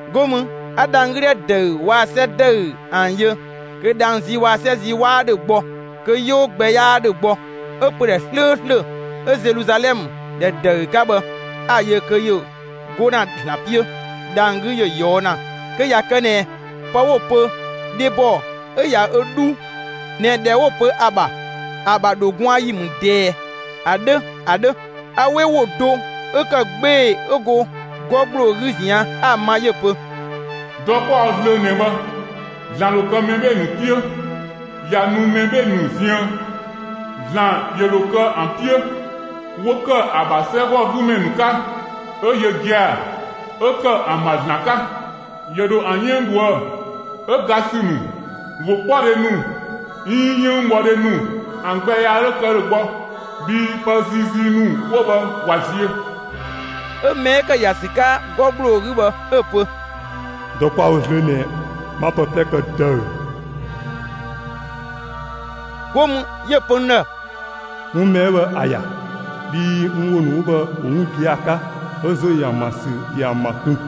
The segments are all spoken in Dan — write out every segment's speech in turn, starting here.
'Go mü 'a dhang‑ 'gü ‑dhɛ ‑dëü waa‑ 'sɛ ‑dëü ‑an yö; kö dhang‑ zii waa‑ 'sɛ zii 'waa ‑dhö gbɔ, kö 'yoo gbɛ 'yaa ‑dhö gbɔ. 'Ö pödhɛ 'slööslö 'ö Zeluzalɛmë ‑dhɛ ‑dëü 'ka bhë, 'a‑ yö kö ‑yö 'go ‑na ‑Zlan 'piö dhang‑ 'gü ‑yö ꞊yɔɔ' ‑na kö ꞊ya kë ꞊nɛ pë 'wo‑ pö dhebɔ 'ö ꞊ya ö 'dhu ꞊nɛ ‑dhɛ 'wo pö ‑a ‑bha, ‑a ‑bha ‑dho gwaan ‑yi ‑mü ꞊dɛɛ ‑a 'dhö ‑a 'dhö. A 'we ‑wo do 'ö ‑kë 'gbee‑ 'ö go 'gɔ ‑gbloo 'gü ꞊zian' 'a‑ ma 'yö‑ pö: «Dɔ 'kwa‑ wo zlöö ꞊nɛ bhë, ‑Zlan ‑dho kë mɛ 'bhee‑ ‑nu 'piö, ꞊ya nu mɛ 'bhee‑ ‑nu ziën. ‑Zlan ‑yö ‑dho kë ‑an 'piö, 'wo ‑kë ‑a ‑bha 'sɛgɔgümɛ ‑nu 'ka, 'ö yö gia‑ 'ö ‑kë ‑an ‑bha ‑Zlan 'ka. ‑Yö ‑dho ‑an 'yënng ꞊dhuë'‑. 'Ö ga ‑sü ‑nu, ‑wokpɔdhe ‑nu 'iin 'yënngbhɔdhe ‑nu ‑an gbɛ yaa 'dho kë ‑dhö gbɔ, bhii pë ziizii ‑nu 'wo bhë ꞊wa ziö.» 'Ö mɛ 'ö ‑kë ‑ya ‑sü 'ka 'gɔ ‑gbloo 'gü bhë, 'ö‑ pö: «Dɔ 'kwa‑ wo zlöö ꞊nɛ bhë, 'ma pë 'plɛ kë ‑dëü.» 'Go mü 'yö‑ pö n ‑dhë: «'Wun mɛ 'ö bhë ‑a ‑ya; bhii n ‑wo ‑nu 'wo bhë ‑wo 'wun gia‑ 'ka, 'ö ‑zo ‑yö ‑an ‑bha ‑sü ‑yö ‑an ‑ma kun.»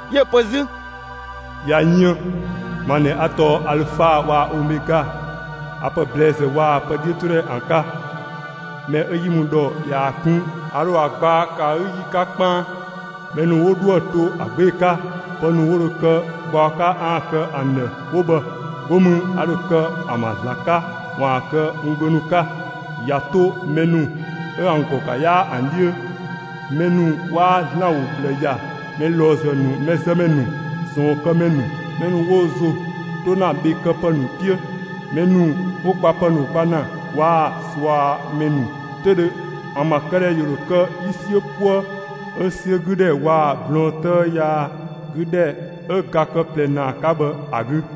'Yö‑ pö 'zü: «꞊Ya yën, ma ꞊nɛ 'a tɔɔ Alüfa waa‑ Omɛga; 'a pë ‑blɛɛzë waa‑ pë 'dhiötodhɛ ‑an 'ka. Mɛ 'ö 'yi mü ‑dhɔ ꞊yaa‑ 'kun, a ‑dho ‑a gbaa ‑kë ‑a 'gü ‑yi 'ka 'kpaan. Mɛ ‑nu 'wo 'dhoë‑ to ‑a 'gbee‑ 'ka, pë ‑nu 'wo dho kë gbaɔ 'ka 'aan‑ kë ‑an ‑dhë 'wo bhë, 'go mü a ‑dho kë ‑an ‑bha ‑Zlan 'ka ‑waan kë n gbö ‑nu 'ka. ꞊Ya 'to mɛ ‑nu 'ö ‑an ‑gɔ ‑ga 'yaa ‑an 'dhiö ‑nu, mɛ 'waa ‑Zlan ‑wo ꞊bhlë ‑ya, mɛ ꞊lɔɔzë ‑nu, mɛzëmɛ ‑nu, ꞊sɔɔnkëmɛ ‑nu, mɛ ‑nu 'wo wo ‑zo 'to ‑na bhë këpë ‑nu 'piö ‑nu, mɛ ‑nu 'wo gbapë ‑nu gba ‑na waa‑ ꞊suamɛ ‑nu 'töüdhö, ‑an ‑bha këdhɛ ‑yö ‑dho kë 'yi 'siö‑ 'puëë 'ö 'siö 'gü ‑dhɛ waa‑ blɔɔn 'tëë yaa 'gü ‑dhɛ 'ö ga kë ꞊plɛ ‑naa 'ka bhë ‑a 'gü.»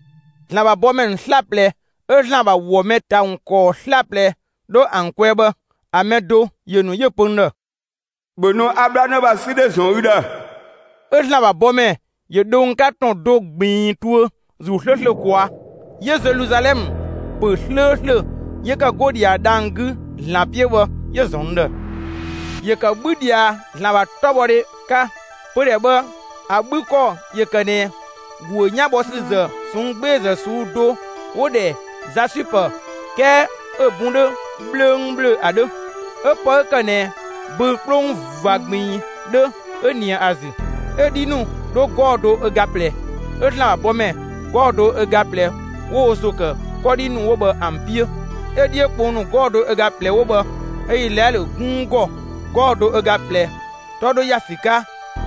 ‑Zlan ‑bha bɔmɛ ‑nu 'slaplɛ 'ö ‑Zlan ‑bha ‑wɔ mɛ ‑ta ‑wun ‑kɔɔ 'slaplɛ 'dho ‑an kwɛɛ bhë, ‑a mɛ do ‑yö ‑nu 'yö‑ pö n ‑dhë: «‑Bhö nu 'a 'bhlanë ‑bha 'sü dhe ‑zɔn ü ‑dhë!» 'Ö ‑Zlan ‑bha bɔmɛ ‑yö dho n 'ka ‑tɔn do ꞊gbiin tuö ‑Zuu 'slööslö ꞊kwaa'. 'Yö Zeluzalɛmë ‑pö 'slööslö 'yö ‑kë go ꞊dhia dhang‑ 'gü ‑Zlan 'piö bhë 'yö‑ ‑zɔn n ‑dhë. ‑Yö ‑kë 'bhü ꞊dhia ‑Zlan ‑bha 'tɔbhɔdhe 'ka. Pödhɛ bhë ‑a 'bhü ‑kɔ ‑yö ‑kë ꞊nɛ ‑guö 'yanbhɔsüzë ꞊sɔnng' 'gbeezë ꞊suu'‑ do 'wo‑ ‑dhɛ 'zasüpë 'kɛɛ 'ö‑ bun 'dhö 'bhlöngbhlöng ‑a 'dhö. 'Ö pë 'ö ‑kë ꞊nɛ böü‑ 'kplong ꞊va ꞊gbiin 'dhö 'ö ꞊nië ‑a ‑zü. 'Ö‑ 'dhi ‑nu 'dho 'gɔɔ‑ do ö ga ꞊plɛ, 'ö ‑Zlan ‑bha bɔmɛ 'gɔɔ‑ do ö ga ꞊plɛ ‑wo wo ‑zo ‑kë 'kɔdhi ‑nu 'wo bhë ‑an 'piö. 'Ö‑ 'dhiö kpong ‑nu 'gɔɔ‑ do ga ꞊plɛ 'wo bhë 'ö Izlaɛlö 'gunng ‑gɔ 'gɔɔ‑ do ga ꞊plɛ 'tɔ 'dho ‑ya ‑sü 'ka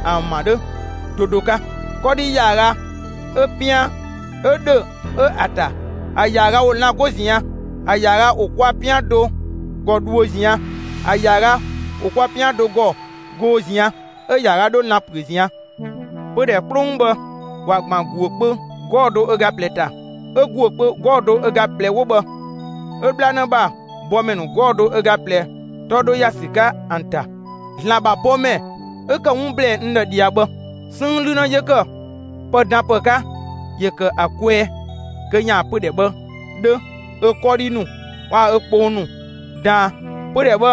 ‑an ‑bha 'dhö do do 'ka. 'Kɔdhi ‑yaaga 'ö‑ 'pian 'ö ‑dhö ö ‑a ‑ta. ‑A ‑yaaga ‑wo lan‑ 'go ꞊zian'; ‑a ‑yaaga ‑wo kwa 'pian do ‑gɔ dhuö ꞊zian', ‑a ‑yaaga ‑wo kwa 'pian do ‑gɔ goo ꞊zian'; 'ö‑ ‑yaaga 'dho lan‑ ‑püö ꞊zian'. Pödhɛ 'kplong bhë, ‑wa ‑gban ‑guö kpö 'gɔɔ‑ do ga ꞊plɛ ‑ta. 'Ö ‑guö 'gɔɔ‑ do ga ꞊plɛ 'wo bhë 'ö 'bhlanë ‑bha bɔmɛ ‑nu 'gɔɔ‑ do ga ꞊plɛ 'tɔ 'dho ‑ya ‑sü 'ka ‑an ‑ta. ‑Zlan ‑bha bɔmɛ 'ö ‑kë 'wun ‑blɛɛ n ‑dhë ꞊dhia bhë, 'sënng 'lü 'në 'yö ‑kë pëdanpë 'ka ‑yö ‑kë ‑a kwɛɛ, kö ‑yaan pödhɛ bhë 'dhö, ö 'kɔdhi ‑nu waa‑ ö 'kplong ‑nu daan. Pödhɛ bhë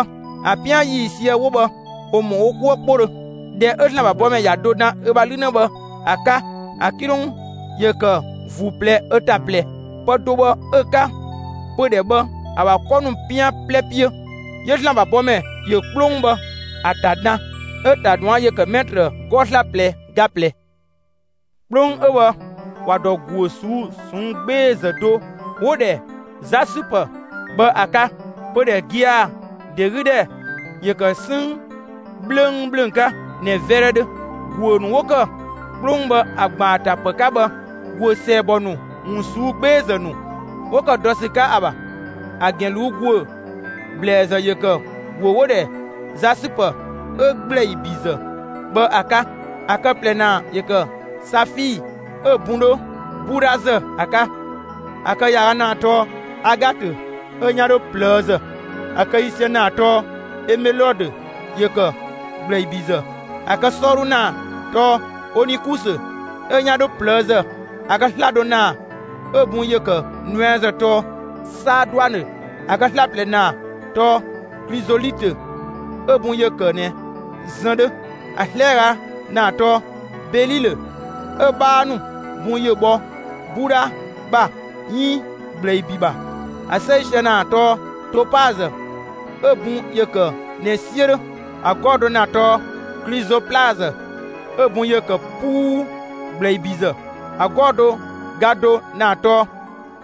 ‑a 'pian ‑yiisië 'wo bhë, ‑wo ‑mɔ wo 'kuë 'kpodhö. ꞊Dhɛ 'ö ‑Zlan ‑bha bɔmɛ ‑ya do dan ö ‑bha 'lü 'në bhë ‑a 'ka, ‑a 'kilong ‑yö ‑kë ‑vuu ꞊plɛ ö ‑ta ꞊plɛ. Pë do bhë 'ö‑ 'ka pödhɛ bhë ‑a ‑bha 'kɔ ‑nu 'pian 'plɛ 'piö. 'Yö ‑Zlan ‑bha bɔmɛ ‑yö 'kplong bhë ‑a ‑ta dan. 'Ö‑ ‑ta ꞊duan' ‑yö ‑kë 'mɛtrë 'gɔɔ‑ 'slaplɛ ga ꞊plɛ. 'Kplong 'ö bhë ‑wa ‑dɔ ‑guö ꞊suu'‑ ꞊sɔnng' 'gbeezë do 'wo‑ ‑dhɛ 'zasüpë bhë ‑a 'ka. Pödhɛ gia‑ ‑de 'gü ‑dhɛ ‑yö ‑kë 'sënng 'bhlöngbhlöng 'ka ꞊nɛ 'vɛdhɛ 'dhö. ‑Guö ‑nu 'wo ‑kë 'kplong bhë ‑a ‑gban ‑a ‑ta ‑pë 'ka bhë, ‑guö ‑sɛɛbɔ ‑nu ‑wun ꞊suu'‑ 'gbeezë ‑nu ‑wo ‑kë dɔ ‑sü 'ka ‑a ‑bha. ‑A ‑gɛn ꞊luu'‑ ‑guö ‑blɛɛzë ‑yö ‑kë ‑guö 'wo‑ ‑dhɛ 'zasüpë ('ö ‑gblɛibizë) bhë ‑a 'ka; ‑a kë ꞊plɛ ‑naa ‑yö ‑kë safii, ('ö‑ bun 'dho 'budhazë) ‑a 'ka. ‑A kë ‑yaaga ‑naa tɔɔ agatö, 'ö‑ 'yan 'dho ꞊plëëzë. ‑A kë ‑yiisië ‑naa tɔɔ emelodö. (‑Yö ‑kë ‑gblɛibizë.) ‑A kë 'sɔɔdhu ‑naa tɔɔ onikusö 'ö‑ 'yan 'dho ꞊plëëzë; ‑a kë 'slado ‑naa ('ö‑ bun ‑yö kë nuɛazë) tɔɔ 'saaduanö. ‑A kë 'slaplɛ ‑naa tɔɔ klizolitö 'ö‑ bun ‑yö ‑kë ꞊nɛ zën 'dhö; ‑a 'slɛaga ‑naa tɔɔ belilö ('ö‑ 'bhaa ‑nu bun ‑yö bhɔ 'budha ‑bha 'iin ‑gblɛibi ‑bha). ‑A 'sɛisië ‑naa tɔɔ topazë ('ö‑ bun ‑yö ‑kë ꞊nɛ 'siö 'dhö). ‑A 'gɔɔ‑ do ‑na tɔɔ klizoplazë ('ö‑ bun ‑yö ‑kë 'puu ‑gblɛibizë). ‑A 'gɔɔ‑ do ga do ‑naa tɔɔ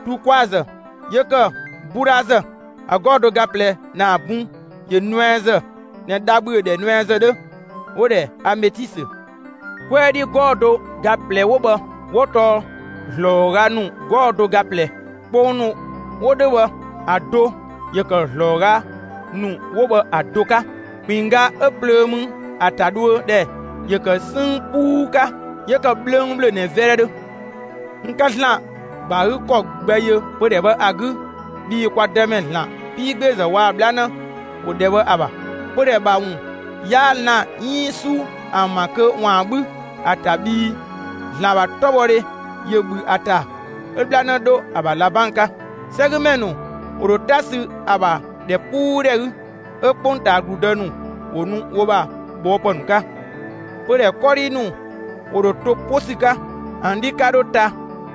tuukwaazë (‑yö ‑kë 'budhazë); ‑a 'gɔɔ‑ do ga ꞊plɛ ‑naa (bun ‑yö nuɛazë ꞊nɛ dha ‑bhüö ‑dhɛ nuɛazë 'dhö) 'wo‑ ‑dhɛ ametisö. 'Kwɛɛ 'dhi 'gɔɔ‑ do ga ꞊plɛ 'wo bhë 'wo tɔɔ ‑zlɔɔga ‑nu 'gɔɔ‑ do ga ꞊plɛ. Kpong ‑nu 'wo 'dhö bhë ‑a do ‑yö ‑kë ‑zlɔɔga ‑nu 'wo bhë ‑a do 'ka; ‑kpinngga 'ö plöö mü ‑a ‑ta dhuö ‑dhɛ ‑yö kë 'sënng 'puu 'ka; 'yö ‑kë 'bhlöngbhlöng ꞊nɛ 'vɛdhɛ 'dhö. N 'ka ‑Zlan ‑gba ‑a 'gü ‑kɔ gbɛ yö pödhɛ bhë ‑a 'gü, bhii kwa Dëmɛ ‑Zlan 'piigbeezë waa‑ 'bhlanë ‑wo ‑dhɛ bhë ‑a ‑bha. Pödhɛ ‑bha ‑wun 'yaa lan‑ 'iin 'su ‑an ‑bha kö ‑waan 'bhü ‑a ‑ta, bhii ‑Zlan ‑bha 'tɔbhɔdhe ‑yö ‑bhü ‑a ‑ta, 'ö 'bhlanë 'dho ‑a ‑bha ꞊labang 'ka. 'Sɛgümɛ ‑nu ‑wo ‑dho 'ta sü ‑a ‑bha ‑dhɛpuudhɛ 'gü, 'ö 'kpongtaa ‑gludë ‑nu ‑wo nu wo ‑bha ꞊bhɔɔpë ‑nu 'ka. Pödhɛ 'kɔdhi ‑nu ‑wo ‑dho to 'po ‑sü 'ka. ‑An 'dhi 'ka 'dho ta,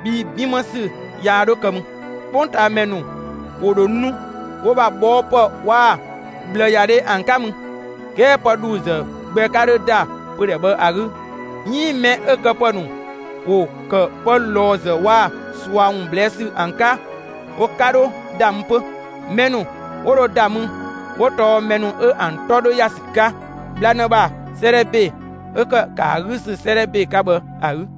bhii 'bin 'më ‑sü yaa 'dho kë mü. 'Kpongtaamɛ ‑nu ‑wo ‑dho nu wo ‑bha ꞊bhɔɔpë waa‑ ꞊bhlëyadhe ‑an 'ka mü. 'Kɛɛ pë ‑dhuuzë gbɛ 'ka 'dhö ‑da pödhɛ bhë ‑a 'gü, 'iin mɛ 'ö‑ këpë ‑nu ‑wo ‑kë pë ꞊lɔɔzë waa‑ ꞊sua ‑wun ꞊blɛɛ' ‑sü ‑an 'ka, wo 'ka 'dho ‑da mü 'pö. Mɛ ‑nu 'wo dho ‑da mü, 'wo tɔɔ mɛ ‑nu 'ö ‑an 'tɔ 'dho ‑ya ‑sü 'ka 'bhlanë ‑bha 'sëëdhɛ ‑be 'ö ‑kë ‑a 'gü ‑sü 'sëëdhɛ ‑be 'ka bhë ‑a 'gü.